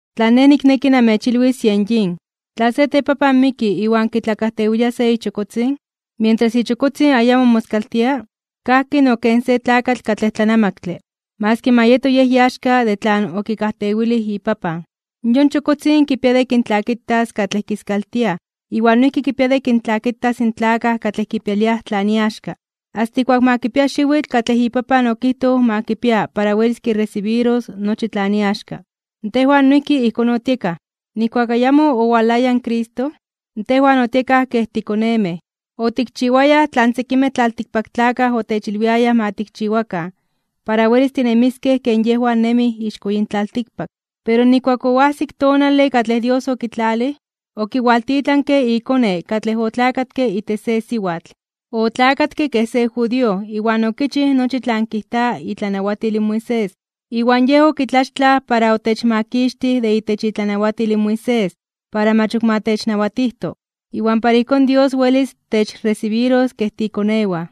Tlan nej nikneki namechilwis yen yin: Tla se tepapan miki iwan kitlakajtewilia se ichokotzin, mientras ichokotzin ayamo moskaltia, kajki no ken se tlakatl katlej tlanamaktle, maski ma yeto yej iaxka de tlan okikajtewilij ipapan. Yon chokotzin kipia de kintlakitas katlej kiskaltiaj iwan noijki kipia de kintlakitas in tlakaj katlej kipialiaj tlan iaxka, asta ijkuak ma kipia xiwitl katlej ipapan okijtoj ma kipia para welis kiresibiros nochi tlan iaxka. Tejwan noijki ijkón otiekaj. Nijkuak ayamo owalaya in Cristo, tejwan otiekaj kej tikonemej, otikchiwayaj tlan sekimej tlaltikpaktlakaj otechilwiayaj ma tikchiwakan para welis tinemiskej ken yejwan nemij ixko yin tlaltikpak. Pero nijkuak oajsik tonale katlej Dios okitlalij, okiwaltitlanke iKone katlej otlakatke itech se siwatl. Otlakatke kej se judío iwan okichij nochi tlan kijta itlanawatil in Moisés. Iwan Yej okitlaxtlaj para otechmakixtij de itech itlanawatil in Moisés para mach ok ma technawatijto, iwan para ijkón Dios welis techresibiros kej tiikonewan.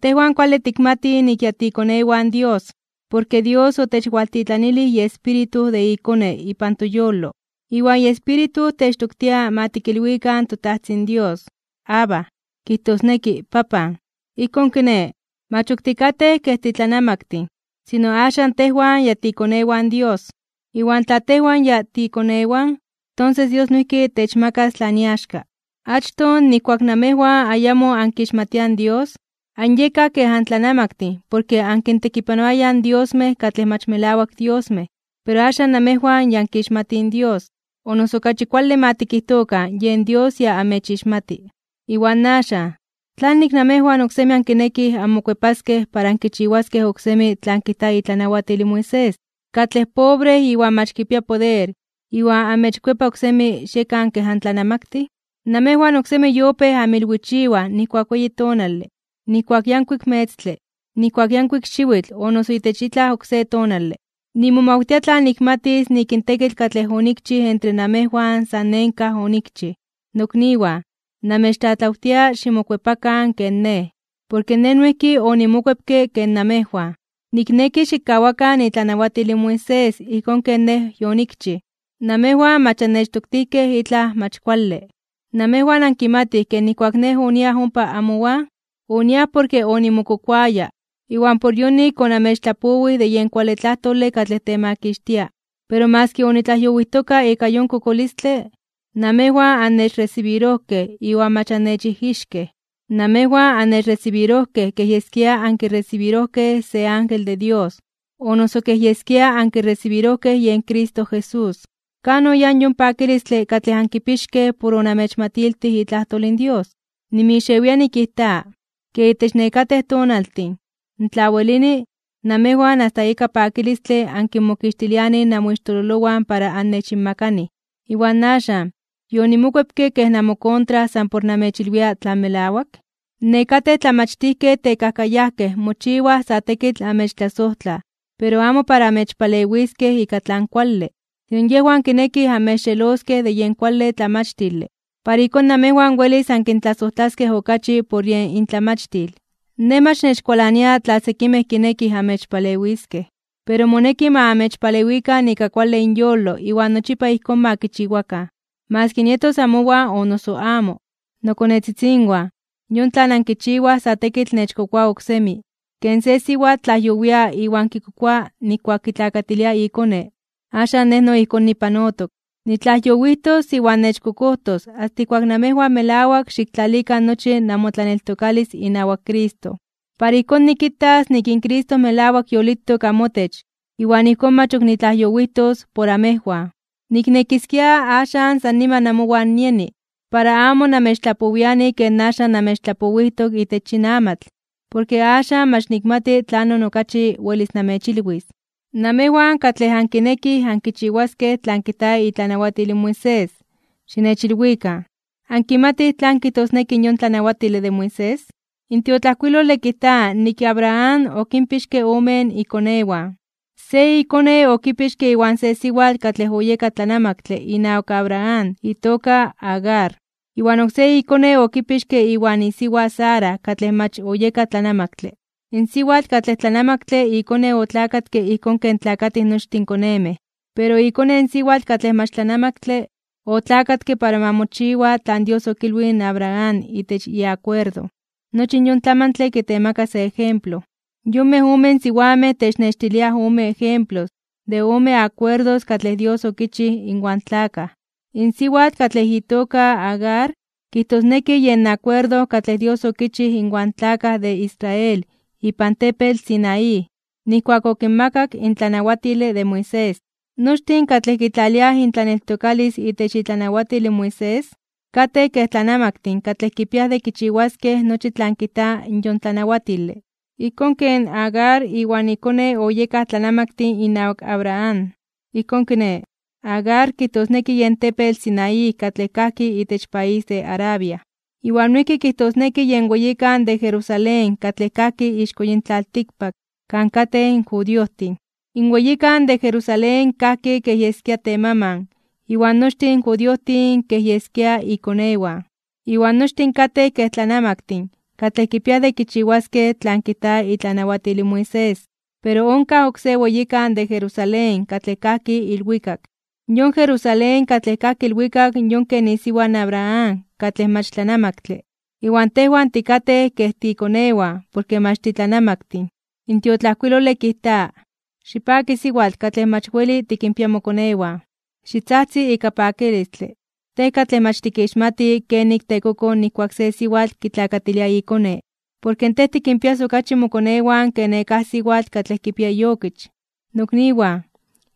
Tejwan kuale tikmatij nik ya tiikonewan Dios, porke Dios otechwaltitlanilij iEspíritu de iKone ipan toyolo. Iwan iEspíritu techtoktia ma tikilwikan toTajtzin Dios: “¡Abba!” Kijtosneki: “¡Papan!” Ijkón kiné, mach ok tikatej kej titlanamaktin, sino axan tejwan ya tiikonewan Dios. Iwan tla tejwan ya tiikonewan, tonses Dios noijki techmakas tlan iaxka. Achtoj, nijkuak namejwan ayamo ankixmatiaj in Dios, anyekaj kej antlanamaktin porke ankintekipanoayaj in diosmej katlej mach melawak diosmej. Pero axan namejwan ya ankixmatij in Dios, o noso okachi kuale ma tikijtokan yen Dios ya amechixmati. Iwan axan, ¿tlanik namejwan oksemi ankinekij anmokuepaskej para ankichiwaskej oksemi tlan kijta itlanawatil in Moisés, katlej pobre iwan mach kipia poder, iwan amechkuepa oksemi xiekan kej antlanamaktin? Namejwan oksemi yopéj anmilwichiwaj nijkuak weyi tonale, nijkuak yankuik metztle, nijkuak yankuik xiwitl o noso itech itlaj oksé tonale. Nimomawtia tla nikmatis nik in tekitl katlej onikchij entre namejwan san nenkaj (en vano) onikchij. Nokniwan, namechtlatlawtia ximokuepakan ken nej, porke nej noijki onimokuepke ken namejwan. Nikneki xikkawakan itlanawatil in Moisés ijkón ken nej yonikchij. Namejwan mach annechtoktijkej itlaj mach kuale. Namejwan ankimatij ke nijkuak nej oniaj ompa amowan, oniaj porke onimokokoaya, iwan por yonik onamechtlapowij de yen kuale tlajtole katlej temakixtia. Pero maski onitlajyowijtoka ika yon kokolistle, namejwan annechresibirojkej iwan mach annechijixkej. Namejwan annechresibirojkej kej yeskia ankiresibirojkej se ángel de Dios, o noso kej yeskia ankiresibirojkej yen Cristo Jesús. ¿Kan oyáj yon pakilistle katlej ankipixkej por onamechmatiltij itlajtol in Dios? Nimixewia nikijta, ke itech nekatej tonaltin, tla welini, namejwan asta ika pakilistle ankinmokixtilianij namoixtololowan para annechinmakanij. Iwan axan, ¿yonimokuepke kej namokontra san por namechilwia tlan melawak? Nekatej tlamachtijkej tekajkayajkej mochiwaj sa tekitl amechtlasojtlaj, pero amo para amechpalewiskej ika tlan kuale. Sino yejwan kinekij amechxeloskej de yen kuale tlamachtile, para ijkón namejwan welis ankintlasojtlaskej okachi por yen intlamachtil. Nej mach nechkualania tla sekimej kinekij amechpalewiskej, pero moneki ma amechpalewikan ika kuale inyolo iwan nochipa ijkón ma kichiwakan, maski nietos amowan o noso amo. Nokonetzitzinwan, yon tlan ankichiwaj sa tekitl nechkokoa oksemi. Ken se siwatl tlajyowia iwan kikokoa nijkuak kitlakatilia ikone. Axan nej no ijkón nipanotok. Nitlajyowijtos iwan nechkokojtos asta ijkuak namejwan melawak xiktlalikan nochi namotlaneltokalis inawak Cristo, para ijkón nikitas nik in Cristo melawak yolitok amotech, iwan ijkón mach ok nitlajyowijtos por amejwan. Niknekiskia axan san niman amowan nieni, para amo namechtlapowiani ken axan namechtlapowijtok itech yin amatl, porke axan mach nikmati tlanon okachi welis namechilwis. Namejwan katlej ankinekij ankichiwaskej tlan kijta itlanawatil in Moisés, xinechilwikan: ¿ankimatij tlan kijtosneki in yon tlanawatile de Moisés? In tiotlajkuilole kijta nik Abraham okinpixke ome ikonewan: se ikone okipixke iwan se siwatl katlej oyeka tlanamaktle inawak Abraham itoka Agar, iwan oksé ikone okipixke iwan isiwa Sara katlej mach oyeka tlanamaktle. In siwatl katlej tlanamaktle ikone otlakatke ijkón ken tlakatij nochtin konemej. Pero ikone in siwatl katlej mach tlanamaktle, otlakatke para ma mochiwa tlan Dios okilwij in Abraham itech iakuerdo. Nochi yon tlamantle kitemaka se ejemplo. Yonmej omen siwamej technextiliaj ome ejemplos de ome akuerdos katlej Dios okichij inwan tlakaj. In siwatl katlej itoka Agar kijtosneki yen akuerdo katlej Dios okichij inwan tlakaj de Israel ipan tepetl Sinaí, nijkuak okinmakak in tlanawatile de Moisés. Nochtin katlej kitlaliaj intlaneltokalis itech itlanawatil in Moisés, katej kej tlanamaktin katlej kipiaj de kichiwaskej nochi tlan kijta yon tlanawatile, ijkón ken Agar iwan ikone oyekaj tlanamaktin inawak Abraham. Ijkón kiné, Agar kijtosneki yen tepetl Sinaí katlej kajki itech país de Arabia. Iwan noijki kijtosneki yen weyikan de Jerusalén katlej kajki ixko yin tlaltikpak kan katej in judiojtin. In weyikan de Jerusalén kajki kej yeskia temaman iwan nochtin in judiojtin kej yeskia ikonewan, iwan nochtin katej kej tlanamaktin katlej kipiaj de kichiwaskej tlan kijta itlanawatil in Moisés. Pero onkaj oksé weyikan de Jerusalén katlej kajki ilwikak. Yon Jerusalén katlej kajki ilwikak yon ken isiwa in Abraham katlej mach tlanamaktle, iwan tejwan tikatej kej tiikonewan porke mach titlanamaktin. In tiotlajkuilole kijta: Xipaki siwatl katlej mach weli tikinpia mokonewan. Xitzajtzi ika pakilistle, tej katlej mach tikixmati kenik tekokoj nijkuak se siwatl kitlakatilia ikone. Porke tej tikinpias okachi mokonewan ke nekáj siwatl katlej kipia iokich. Nokniwan,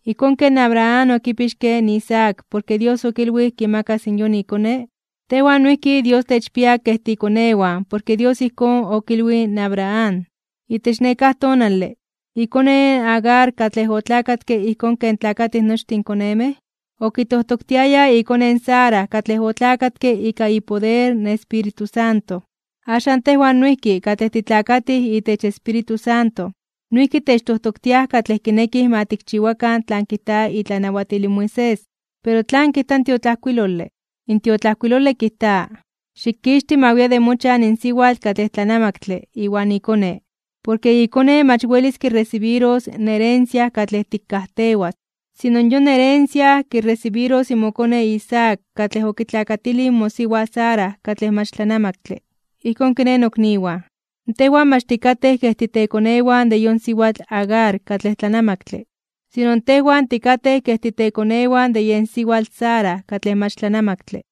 ijkón ken Abraham okipixke in Isaac porke Dios okilwij kimakas yon ikone, tejwan noijki Dios techpia kej tiikonewan porke Dios ijkón okilwij in Abraham. Itech nekáj tonale, ikone in Agar katlej otlakatke ijkón ken tlakatij nochtin in konemej, okitojtoktiaya ikone in Sara katlej otlakatke ika ipoder in Espíritu Santo. Axan tejwan noijki katlej titlakatij itech Espíritu Santo noijki techtojtoktiaj katlej kinekij ma tikchiwakan tlan kijta itlanawatil in Moisés. Pero ¿tlan kijta in tiotlajkuilole? In tiotlajkuilole kijta: “Xikixti ma wia de mochan in siwatl katlej tlanamaktle iwan ikone, porke ikone mach welis kiresibiros in herencia katlej tikkajtewas. Sino yon herencia kiresibiros in mokone Isaac katlej okitlakatilij mosiwa Sara katlej mach tlanamaktle.” Ijkón kiné, nokniwan, tejwan mach tikatej kej titekonewan de yon siwatl Agar katlej tlanamaktle, sino tejwan tikatej kej titekonewan de yen siwatl Sara katlej mach tlanamaktle.